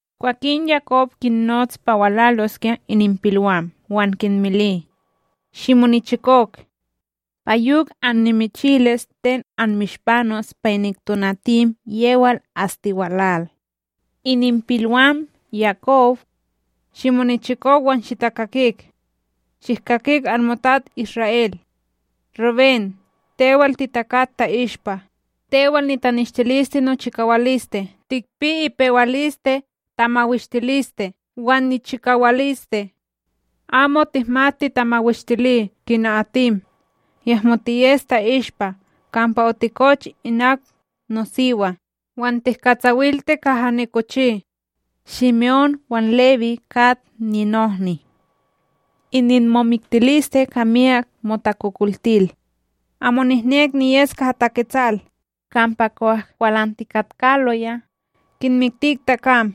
Kwakin Yakob kinnots pa walaloskya ininpilwam wan kinmili: “Shimonichikok, pa yok annimichilis ten anmishpanos pa inik tonatim yewal astiwalal: ’Ininpilwam Yakob: Shimonichikok wan shitakakik; shihkakik anmotats Isra'El. ’Rubén, tewal, titakat ta'ishpa, tewal nitanishtiliste nochikawaliste, tikpi ipewaliste ka tamawishtiliste, wan nichikawaliste. Amo tihmat titamawishtili kina atim, yahmo tiyes ta'ishpa: kampa otikoch inak nosiwa; wan tihkatsawilti kaha nikochi. ’Shime'ón wan Lewí kat ninohni; ininmomiktiliste ka miyak motakokoltil. Amo nihnek niyes kaha taketsal, kampa kwah kwalantikatkaloya! kinmiktik takam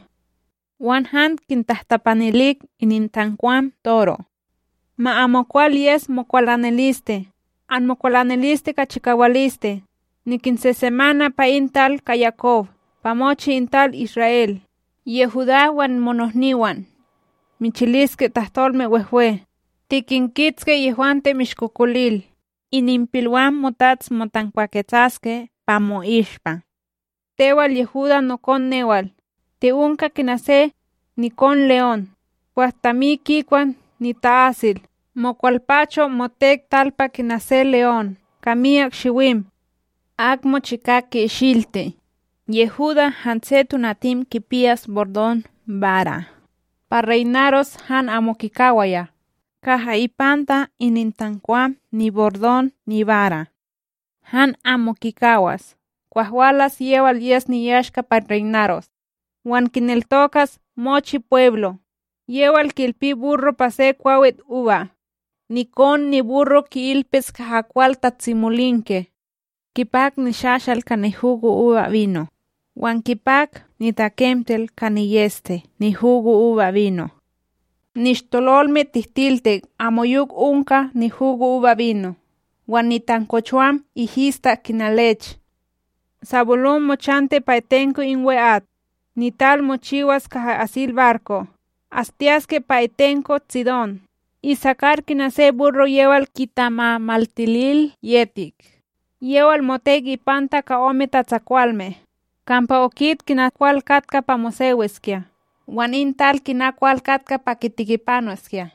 wan han kintahtapanilik inintankwam toro'. Ma amokwal yes mokwalaniliste, anmokwalaniliste ka chikawaliste! Nikinsesemana pa in tal ka Yakob, pa mochi in tal Isra'El. ’Yehudá, wan monohniwan; michiliske tahtolme wehwe, tikinkitski yehwante mishkokolil, ininpilwam motats motankwaketsaske pa mo'ishpa. Tewal Yehudá nokon newal! Ti'onka kina se nikon leon, kwah tami kikwa nita'asil: mowalpacho, motek talpa kina se leon, ka miyak shiwim. Ak mochika ki'ishilti. Yehudá hanse tonatim kipiyas bordon bara, pa reynaros, han amo kikawaya, kaha ipanta inintankwam nibordon nibara, han amo kikawas kwah walas yewal yes niyashka pa reynaros, wan kineltokas mochi pweblo. Yewal ki'ilpi burro pa se kwawitUba, nikon niburro ki'ilpis kaha kwal tatsimolinke; kipak nishashal ka nihugoUbaBino, wan kipak nitakemtel ka niyEste nihugoubaBino. Nishtololme tihtiltik amoyok onka nihugoubaBino; wan nitankochowam ihistak kina lech. ’Sabulón mochanti pa itenko in we'at; nital mochiwas kaha asil barko', Astiyaske pa itenko Tsidón. ’Isakar kina se burro yewal kitamamaltilil yetik yewal motek ipanta ka ome tatsakwalme. Kampa okit kina kwal katka pa mosewiskya wan in tal kina kwal katka pa kitikipanoskya,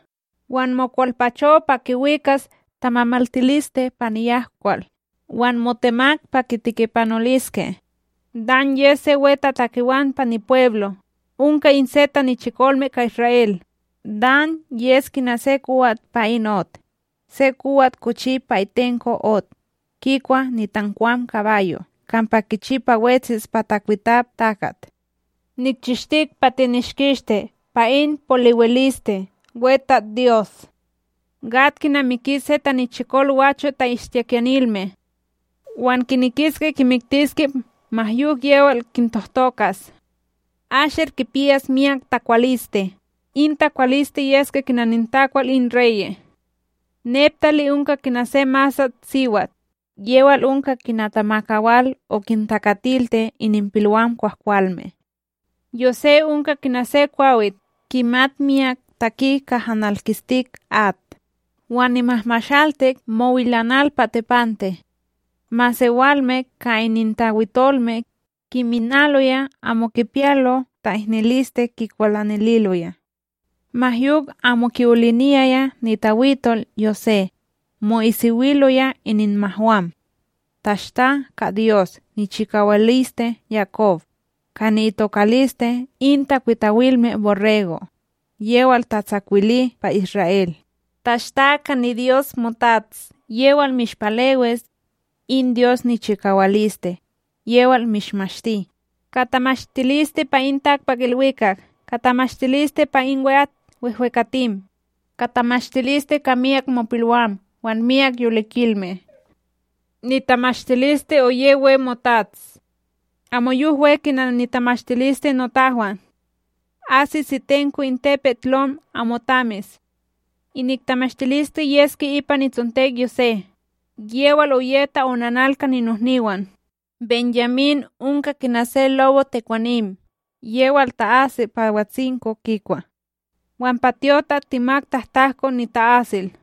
wan mokwalpacho pa kiwikas tamamaltiliste pa niyahkwal wan motemak pa kitikipanoltiske. ’Dan yes se wetatakewan pa nipweblo, onka in se tanichikolme ka Isra'El. Dan yes kina se kowat pa in ot, se kowat kochi pa itenko ot, kikwa nitankwam kabayo' kampa kichi pa wetsis pa takwitap takat. ’Nikchishtik pa tinishkishti pa in polewiliste, WeTatsDyos! ’Gad kinamiki se tanichikol gwacho' ta'ishtikiyanilme, wan kinekiske kimiktiske ma yok yewal kintohtokas. ’Asher kipiyas miyak takwaliste; in takwaliste yeske kina nitakwalme in reye'. ’Neptalí onka kina se masatSiwat, yewal onka kina tamakawal okintakatilti ininpilwam kwahkwalme. ’Yosé onka kina se kwawit kimat miyak taki kaha nalkistik at, wan nimahmashaltik mowilanal pa tepante. Masewalme ka inintawitolme, kiminaloya amo kipiyalo ta'ihniliste kikwalanililoya. Ma yok amo ki'oliniyaya nitawitol Yosé, mo'isiwiloya ininmahwam. Tashta ka Dyos nichikawaliste Yakob, ka ni'itokaliste in takwitawilme borrego', yewal tatsakwili pa Isra'El! Tashta ka niDyos motats, yewal mishpalewis! In Dyos niChikawaliste, yewal mishmashti! Ka tamashtiliste pa in takpakIlwikak! Ka tamashtiliste pa in we'at wehwekatim! Ka tamashtiliste ka myak mopilwam wan myak yolikilme! Nitamashtiliste oye we motats amoyok we kina nitamashtiliste notahwan, asis itenko in tepetLom amoTamis. Inik tamashtiliste yeske ipa nitsontek Yosé, yewal oye ta'onanal ka ninohniwan! ’BenYamín onka kina se lobo tekwanim yewal ta'asi pa watsinko kikwa wan pa tyotak temak tahtahko nita'asil.”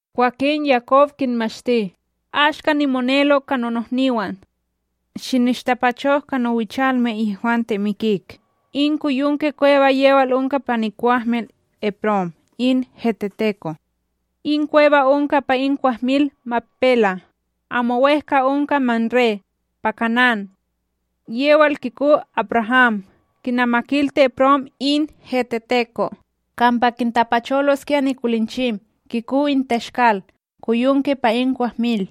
Kwakin, Yakob kinmashti: “Ashka nimonelo ka nonohniwan. Shinishtapachok ka nowichalme yehwante mikik, in koyonke kweba yewal onka pa nikwahmil Eprón in heteteko. In kweba onka pa in kwahmil Makpela, amo wEhka onka Mamré pa Kanán. Yewal kiko AbRaham, kinamakilti Eprón in heteteko, kampa kintapacholoskya nikolinchim kiko in Teshkalkoyonke pa in kwahmil.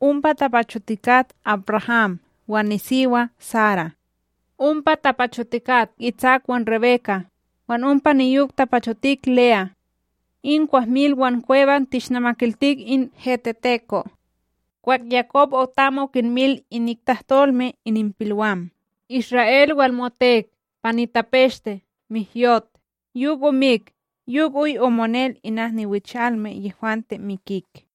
Ompa tapachotikat AbRaham wan nisiwa Sara, ompa tapachotikat Itsak wan Rebeka, wan ompa niyok tapachotik Le'a. In kwahmil wan kweba tishnamakiltik in heteteko'.” Kwah Yakob otam okinmil inik tahtolme ininpilwam, Isra'El walmotek pa nitapeshte, mihyot, yok omik yok oy omonel inak niwichalme yehwante mikik.